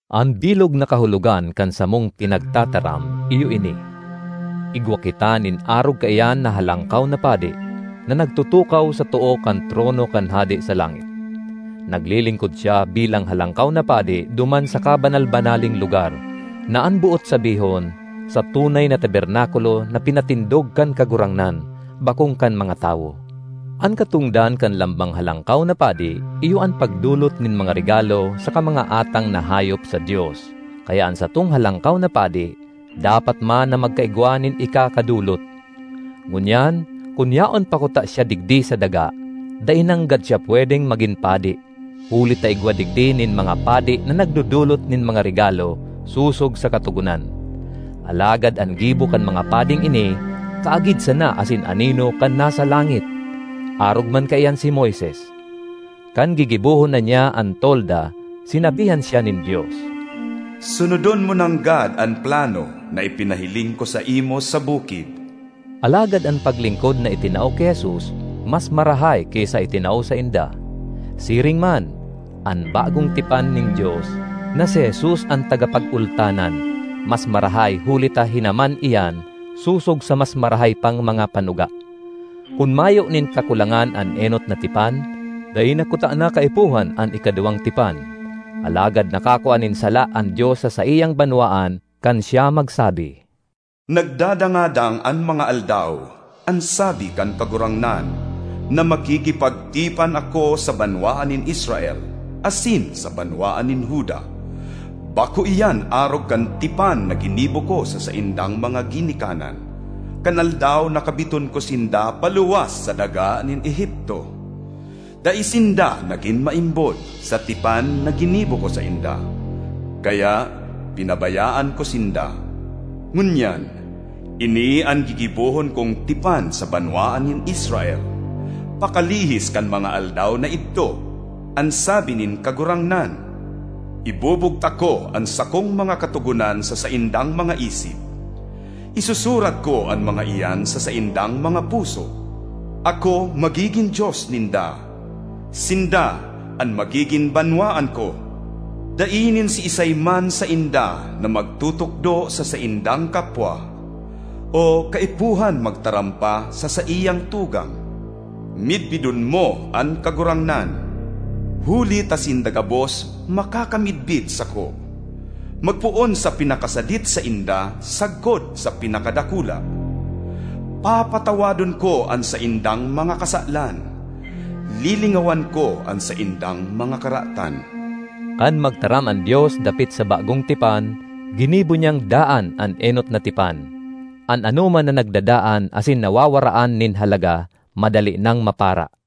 An bilog na kahulogan kan samong pinagtataram iyo ini: igwa kita nin arog kaiyan na Halangkaw na Padi, na nagtutukaw sa too kan trono kan Hade sa langit. Naglilingkod siya bilang Halangkaw na Padi duman sa Kabanal-banaleng Lugar, na an boot sabihon, sa tunay na tabernakulo na pinatindog kan Kagurangnan, bakong kan mga tawo. An katongdan kan lambang halangkaw na padi iyo an pagdolot nin mga regalo saka mga atang na hayop sa Dios, kaya an satong Halangkaw na Padi dapat man na magkaigwa nin ikakadolot. Ngunyan, kun yaon pa kuta siya digdi sa daga, dai nanggad siya pwedeng magin padi, huli ta igwa digdi nin mga padi na nagdodolot nin mga regalo sosog sa Katogonan. Alagad an gibo kan mga pading ini kaagid sana asin anino kan nasa langit. Arog man kaiyan si Moises. Kan gigibohon na niya an tolda, sinabihan siya nin Dios, “Sunodon mo nanggad an plano na ipinahiling ko saimo sa bukid.” Alagad an paglingkod na itinao ki Jesus mas marahay ki sa itinao sainda. Siring man, an bagong tipan nin Dios, na si Jesus an tagapagultanan, mas marahay huli ta hinaman iyan sosog sa mas marahay pang mga panuga. Kun mayo nin kakulangan an enot na tipan, dai na kutana kaipuhan an ikaduwang tipan. Alagad nakakua nin sala an Dios sa saiyang banwaan kan siya magsabi: “Nagdadangadang an mga aldaw, an sabi kan Kagurangnan, na makikipagtipan ako sa banwaan nin Israel, asin sa banwaan nin Juda. Bako iyan arog kan tipan na ginibo ko sa saindang mga ginikanan kan aldaw na kabiton ko sinda paluwas sa daga nin Egipto. Dai sinda nagin maimbod sa tipan na ginibo ko sainda, kaya pinabayaan ko sinda. Ngunyan, ini an gigibohon kong tipan sa banwaan nin Israel, pakalihis kan mga aldaw na idto, an sabi nin Kagurangnan: Ibubugtak ko an sakong mga katogonan sa saindang mga isip, isusurat ko an mga iyan sa saindang mga puso. Ako magigin Dios ninda; sinda an magigin banwaan ko. Dai nin siisay man sainda na magtutukdo sa saindang kapwa, o kaipuhan magtaram pa sa saiyang tugang, ‘Midbidon mo an Kagurangnan.’ Huli ta sinda gabos makakamidbid sako, magpoon sa pinakasadit sainda sagkod sa pinakadakula. Papatawadon ko an saindang mga kasalan; lilingawan ko an saindang mga karatan.” Kan magtaram an Dios dapit sa bagong tipan, ginibo niyang daan an enot na tipan; an anoman na nagdadaan asin nawawaraan nin halaga, madali nang mapara.